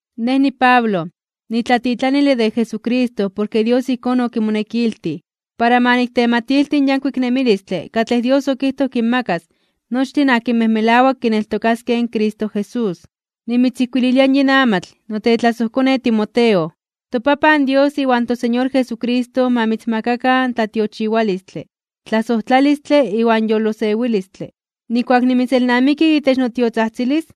Nej niPablo, nitlatitlanile de Jesucristo porke Dios ijkón okimonekiltij, para ma niktematilti in yankuik nemilistle katlej Dios okijtoj kinmakas nochtin akinmej melawak kineltokaskej in Cristo Jesús. Nimitzijkuililia yin amatl, notlasojkone Timoteo. ToPapan Dios iwan toSeñor Jesucristo ma mitzmakakan tlatiochiwalistle, tlasojtlalistle iwan yolosewilistle. Nijkuak nimitzelnamiki itech notiotzajtzilis,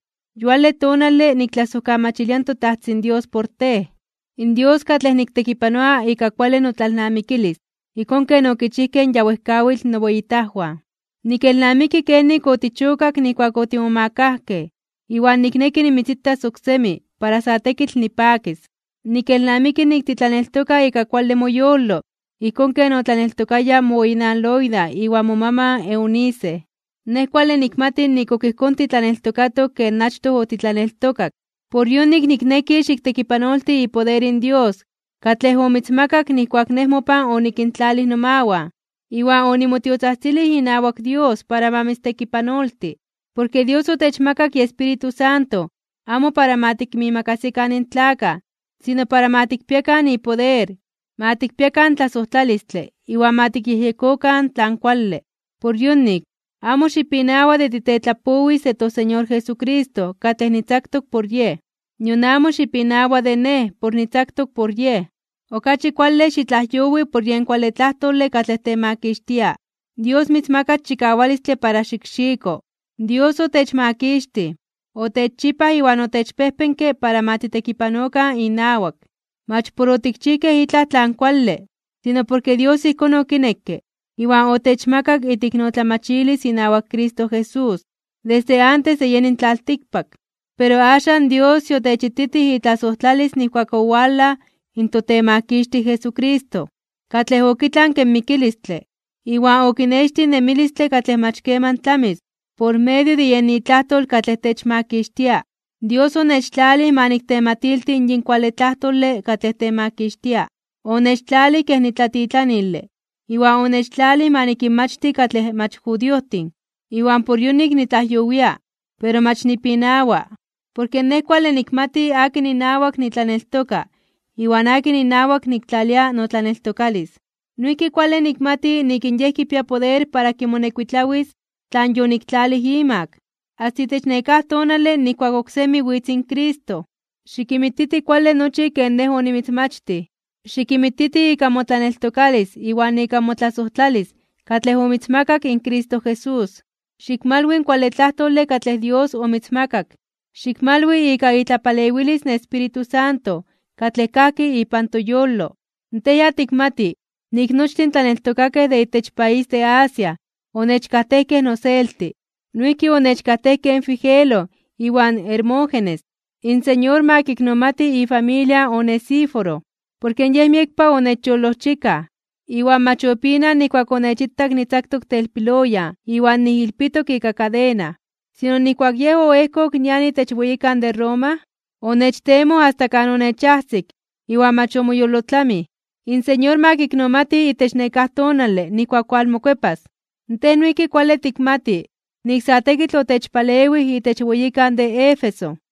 yuale tonale, niktlasojkamachilia in toTajtzin Dios por tej, in Dios katlej niktekipanoa ika kuale notlalnamikilis ijkón ken okichijkej in ya wejkawitl noweyitajwan. Nikelnamiki kenik otichokak nijkuak otimomakajkej, iwan nikneki nimitzitas oksemi para sa tekitl nipakis. Nikelnamiki nik titlaneltoka ika kuale moyolo ijkón ken otlaneltokaya moweyinan Loida iwan momaman Eunice. Nej kuale nikmati nik ok ijkón titlaneltokatok ken achtoj otitlaneltokak. Por yonik nikneki xiktekipanolti ipoder in Dios katlej omitzmakak nijkuak nej mopan onikintlalij nomawan, iwan onimotiotzajtzilij inawak Dios para ma mitztekipanolti. Porke Dios otechmakak iEspíritu Santo amo para ma tikinmiimakasikan in tlakaj, sino para ma tikpiakan ipoder, ma tikpiakan tlasojtlalistle iwan ma tikyejyekokan tlan kuale. Por yonik, amo xipinawa de titetlapowis de toSeñor Jesucristo katlej nitzaktok por Yej, nion amo xipinawa de nej por nitzaktok por Yej. Okachi kuale xitlajyowi por yen kuale tlajtole katlej temakixtia. Dios mitzmakas chikawalistle para xikxiko. Dios otechmakixtij, otechchipaj iwan otechpejpenke para ma titekipanokan inawak. Mach por otikchijkej itlaj tlan kuale, sino porke Dios ijkón okinekke iwan otechmakak iteiknotlamachilis inawak Cristo Jesús, desde antes de yeni in tlaltikpak. Pero axan Dios yotechititij itlasojtlalis nijkuak owalaj in toTemakixtij Jesucristo, katlej okitlanke in mikilistle, iwan okinextij in nemilistle katlej mach keman tlamis por medio de yen itlajtol katlej techmakixtia. Dios onechtlalij ma niktematilti yin kuale tlajtole katlej temakixtia, onechtlalij kej nitlatitlanile iwan onechtlalij ma nikinmachti katlej mach judiojtin. Iwan por yonik nitlajyowia. Pero mach nipinawa, porke nej kuale nikmati akin inawak nitlaneltoka iwan akin inawak niktlalia notlaneltokalis. Noijki kuale nikmati nik in Yej kipia poder para kimonekuitlawis tlan yoniktlalij imak, asta itech nekáj tonale nijkuak oksemi witz in Cristo. Xikinmititi kuale nochi ken nej onimitzmachtij. Xikinmititi ika motlaneltokalis iwan ika motlasojtlalis katlej omitzmakak in Cristo Jesús. Xikmalwi in kuale tlajtole katlej Dios omitzmakak, xikmalwi ika itlapalewilis in Espíritu Santo katlej kajki ipan toyolo. Tej ya tikmati nik nochtin in tlaneltokakej de itech país de Asia onechkajtejkej noselti. Noijki onechkajtejkej in Figelo iwan Hermógenes. In Señor ma kiknomati ifamilia in Onesíforo, porke yej miekpa onechyolojchikaj, iwan mach opinaj (opinawak) nijkuak onechitak nitzaktok telpiloyan iwan nijilpitok ika kadena. Sino, nijkuak yej oejkok nian itech weyikan de Roma, onechtemoj asta kan onechajsik iwan mach omoyolotlamij. In Señor ma kiknomati itech nekáj tonale nijkuak walmokuepas. Tej noijki kuale tikmati nik sa tekitl otechpalewij itech weyikan de Éfeso.